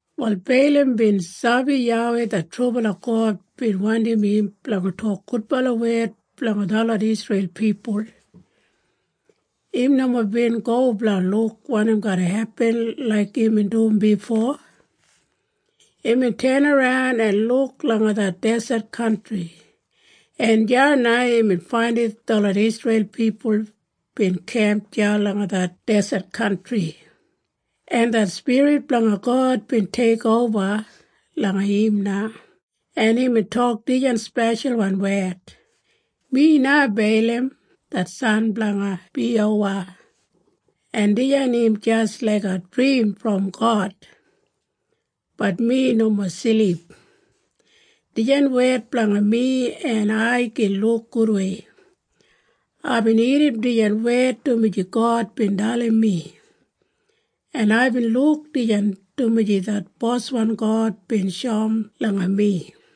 Wal Beilam bin sabi YAWEI det trubala God bin wandim im blanga tok gudbala wed blanga detlot Isreil pipul. Im nomo bin go blanga luk wanim garra hepin laik imbin dum bifo. Imbin tenaran en luk langa det deset kantri, en deya na imbin faindim detlot Isreil pipul bin kemp deya langa det deset kantri. En det spirit blanga God bin teikoba langa im na, en imbin tok dijan speshalwan wed, “Mi na Beilam det san blanga Biyowa, en dijan im jis laiga drim brom God, bat mi nomo silip. Dijan wed blanga mi en ai gin luk gudwei. Aibin irrim dijan wed dumaji God bin dalim mi. En aibin luk dijan dumaji det boswan God bin shoum langa mi.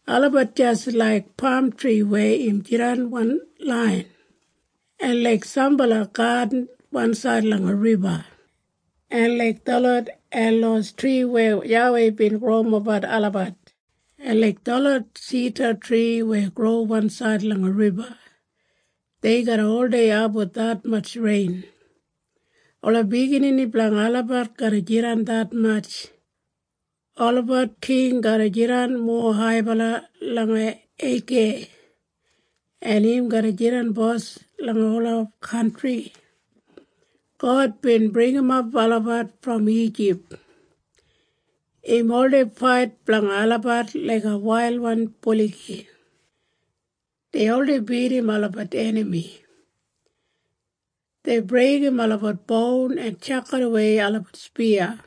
Olabat jis laik pamtri weya im jidan wan lain, en laik sambala gadin wansaid langa riba, en laik detlot elos tri weya YAWEI bin growimap olabat, en laik detlot sidatri weya gro wansaid langa riba. Dei garra oldei abum detmatj rein. Ola biginini blanga olabat garra jidan detmatj. Olabat king garra jidan mowa haibala langa Eigeg, en im garra jidan bos langa ola kantri. God bin bringimap olabat brom Ijip. Im oldei fait blanga olabat laiga wailwan buligi. Dei oldei bidim olabat enami. Dei breigim olabat boun en tjakidawei olabat spiya.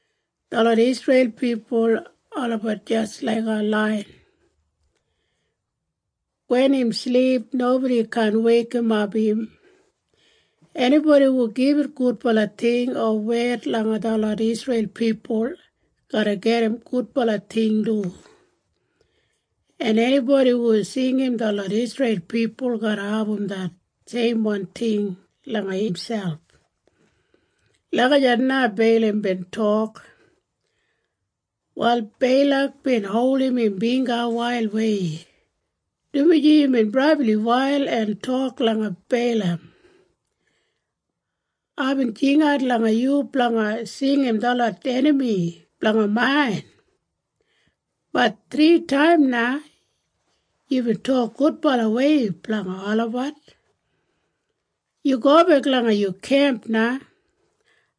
Detlot Isreil pipul olabat jis laiga laiyan. Wen im silip, nobodi kaan weikimap im. Enibodi hu gibit gudbala ting o wed langa detlot Isreil pipul garra gedim gudbala ting du, en enibodi hu singim detlot Isreil pipul garra abum det seimwan ting langa imselp.” Lagijat na Beilam bin tok. Wal Beilak bin holdim im bingga wailwei, dumaji imbin brabli wail en tok langa Beilam, “Aibin jingat langa yu blanga singim detlot enami blanga main, bat thritaim na yubin tok gudbalawei blanga olabat. Yu gobek langa yu kemp na.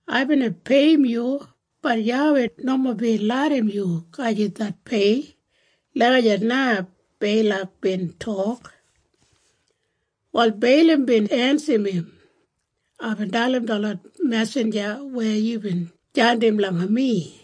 Ai bina peiyim yu, bat YAWEI nomo bin larram yu gajim det pei.” Lagijat na Beilak bin tok. Wal Beilam bin ensim im, “Aibin dalim detlot mesinja weya yubin jandim langa mi,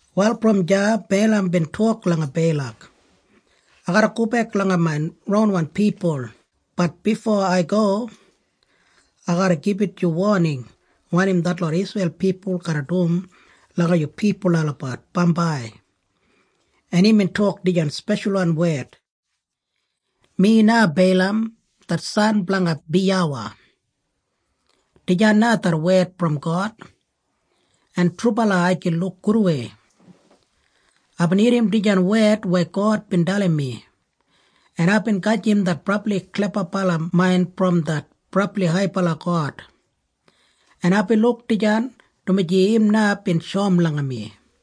Wal brom deya Beilam bin tok langa Beilak, “Ai garra gobek langa main ronwan pipul, bat bifo ai go, ai garra gibit yu woning wanim detlot Isreil pipul garra dum langa yu pipul olabat bambai.” En imbin tok dijan speshalwan wed, “Mi na Beilam det san blanga Biyowa. Dijan na det wed brom God, en trubala ai gin luk gudwei. Aibin irrim dijan wed weya God bin dalim mi, en aibin gajim det brabli klebabala main brom det brabli haibala God, en aibin luk dijan dumaji im na bin shoum langa mi.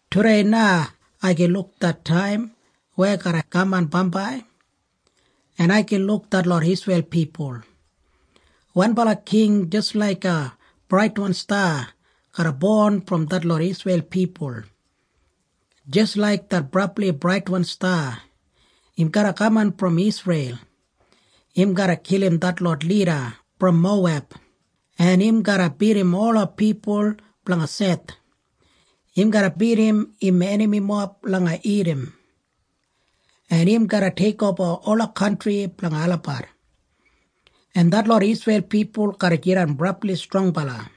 Tudei na ai gin luk det taim weya garra kaman bambai, en ai gin luk detlot Isreil pipul. Wanbala king jis laiga braitwan sta garra bon brom detlot Isreil pipul. Jis laik det brabli braitwan sta, im garra kaman brom Isreil. Im garra kilim detlot lida brom Moweb, en im garra bidim ola pipul blanga Seth. Im garra bidim im enamimob langa Idam, en im garra teikoba ola kantri blanga olabat. En detlot Isreil pipul garra jidan brabli strongbala.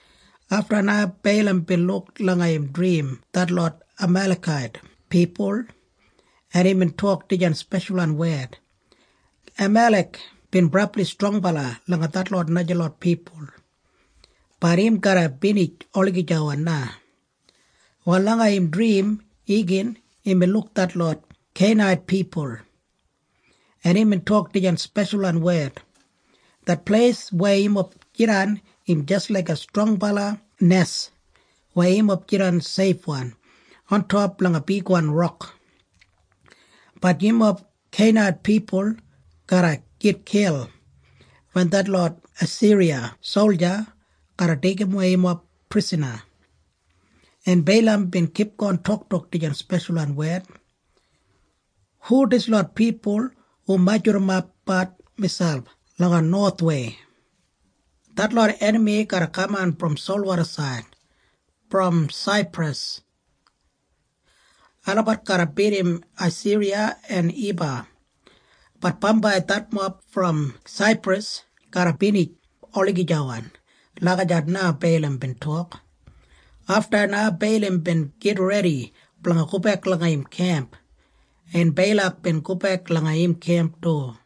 Afta na Beilam bin luk langa im drim detlot Amalekait pipul en imbin tok dijan speshalwan wed, “Amalek bin brabli strongbala langa detlot najalot pipul, bat im garra binij olagijawan na.” Wal langa im drim igin imbin luk detlot Kenait pipul, en imbin tok dijan speshalwan wed, “Det pleis weya yumob jidan im jis laiga strongbala nes weya yumob jidan seifwan ontop langa bigwan rok. Bat yumob Kenait pipul garra gitkil wen detlot Asiriya solja garra deigimwei yumob prisana.” En Beilam bin kipgon toktok dijan speshalwan wed, “Hu dislot pipul hu majurrumapbat miselp langa nowathwei? Detlot enami garra kaman brom solwodasaid brom Saipras. Olabat garra bidim Asiriya en Iba, bat bambai detmob brom Saipras garra binijap olagijawan.” Lagijat na Beilam bin tok. Afta na Beilam bin gitredi blanga gobek langa im kemp, en Beilak bin gobek langa im kemp du.